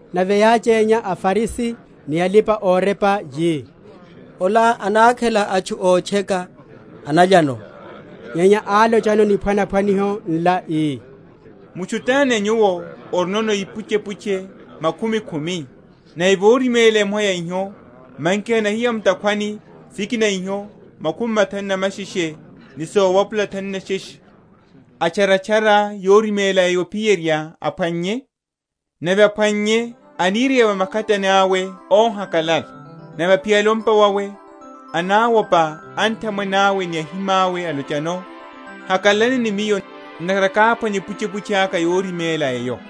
Nave yáchénya aFarisi ni alipa‐orepa, yi, Ola anakhela atchu ótcheka, analyano. Nyenya álochano niphwanaphwaniho nla, ii, Mutchu tani a nyuwo orino ipuchepuche makhumi khumi, nave voriméla emoha ya iho, manki hanahiya mu’takhwani sikina iho makhumi mathanu na masheshe ni sowapula thanu na sheshe, atcharatchara yoriméla eyo ophiyerya aphwannye? Nave aphwannye, anireya va makhatani awe óhakalala. Nave aphiyale o’mpa wawe anawopa anthamwene awe ni ahimawe, alochano, Hakalalani ni miyo, ntakhara káphwanya epuchepuche aka yoriméla eyo.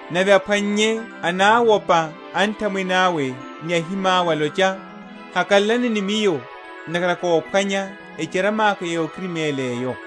Nave aphwannye anawopa anthamwene awe ni ahimawe, alocha, Hakalalani ni miyo, ntakhara káphwanya echarama kárimélihalaka eyo.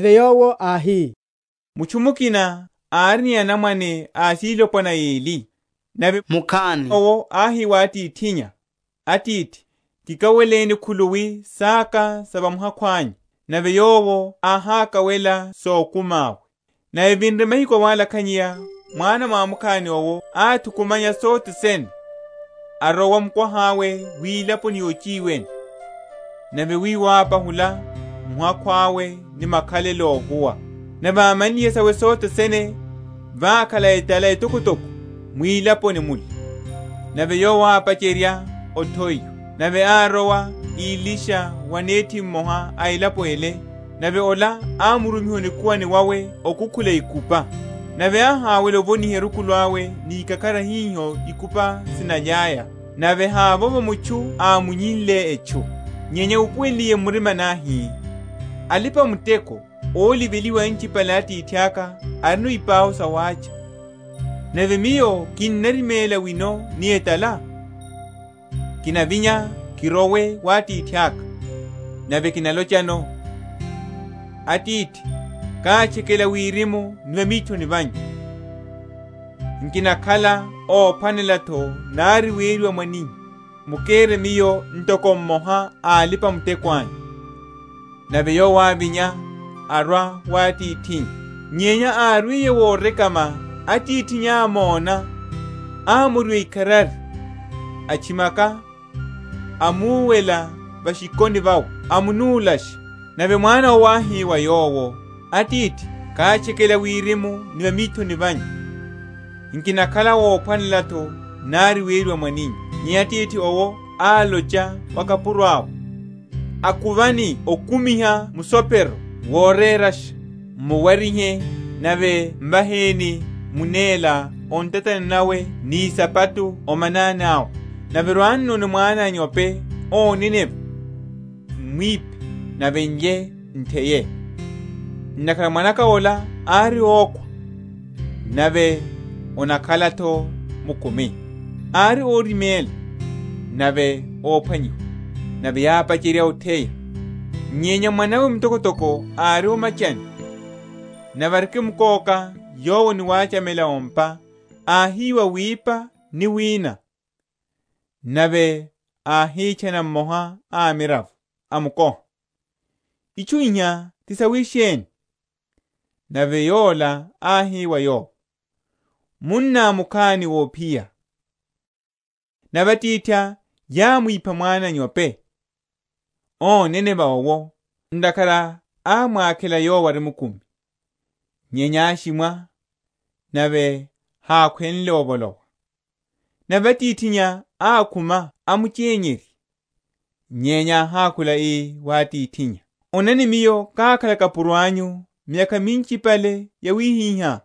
Nave Yowo áhi, Mutchu mukina ári ni anamwane asilopwana eli; nave mukhani owo áhi wa atithinnya, Atithi, kikaweleni khuluwi saka sa va muhakhu anyu. Nave yowo áhákawela sokumi awe. Nave evinre mahiku awalakhanyeya mwana mwamukhani owo áthukumanya sothe sene, arowa mukwaha’we wilaponi yochiwene; nave wiwo ápahula muhakhu awo ni makhalelo óhuwa. Nave ámanliye sawe sothe sene, vákhala etala etokotoko mwilaponi mule, nave yowo ápacherya othowiwa. Nave árowa ílisha wa nethi mmoha a elapo ele; nave ola ámurumiha o nikuwani wawe okukhula ikupa. Nave áhawela ovoniha erukulu awe ni ikakhara hiho ikupa sinalyaya, nave havovo mutchu ámunnyile etchu. Nyenya úpuwenliye m’murimani, áhi, Alipa‐muteko óliveliwa anchipale a atithaka arino ipau sawácha, nave miyo kinnariméla wino ni etala? Kinavinya kirowe wa atithaka, nave kinalochano, Atithi kátchekela wirimu ni va mithoni vanyu: nkinakhala óphwanela’tho nari weriwa mwaninyu; mukere miyo ntoko mmoha a alipa‐muteko anyu. Nave yowo ávinya, arwa wa atithinnya. Nyenya árwiye worekama, atithinnya ámóna, amoriwa ikharari, atchimaka, amuwela va’shikoni vawe, amunúlasha. Nave mwana owo áhi wa yowo, Atithi kátchekela Wirimu ni va mithoni vanyu, nkinakhala óphwanela’tho nari weriwa mwaninyu. Nyenya atithi owo álocha wa akapuro awe, Akuvani okumiha musopero worerasha, m’muwarihe; nave m’vaheni munela o ntatani nawe ni isapato o manani awe: nave rwannoni mwana a’nyope óneneva, m’mwiphe, nave n’lye, n’theye: ntakhara mwana’ka ola ári ókhwa, nave anakhala’tho mkumi; ári óriméla, nave ophwanyiwa. Nave yápacherya otheya. Nyenya mwanawe mtokotoko ári o’machani. Nave arikimkóka yowo ni wachamela o’mpa, áhiwa wipa ni wina. Nave áhitchana mmoha a amiravo, amukoha, Itchu iha ti sawisheni? Nave yola áhi wa yowo, Munná mukhani ophiya; nave atithá yámwipha mwana a’nyope óneneva owo, ntakhara ámwakhela yowo ari mkumi. Nyenya áshimwa, nave hákhwenle ovolowa. Nave atithinnya ákhuma amuchenyerya. Nyenya áhákhula ii wa atithinnya, Onani miyo kákhala kapuro anyu miyakha minchipale yawihiha,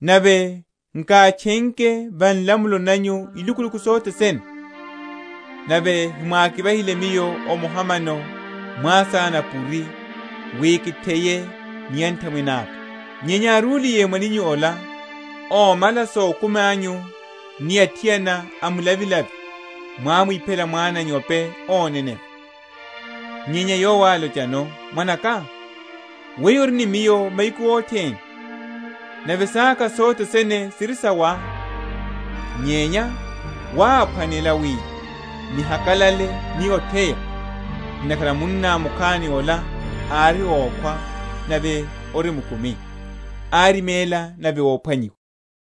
nave nkátchenke va nlamulo nanyu ilukuluku sothe sene; nave hemwákivahile miyo omoha mano mwasana a’puri, wi kitheye ni anthamwene aka. Nyenya áruliye mwaninyu ola, ómala sokumi anyu ni athiana a mlavilavi mwámwiphela mwana a’nyope óneneva. Nyenya yowo álochano, Mwanaka, weyo ori ni miyo mahiku othene, nave saka sothe sene siri sawá. Nyenya wáphwanela wi nihakalale ni otheya: ntakhara munná mukhani ola ári ókhwa nave ori mkumi; áriméla, nave ophwanyiwa.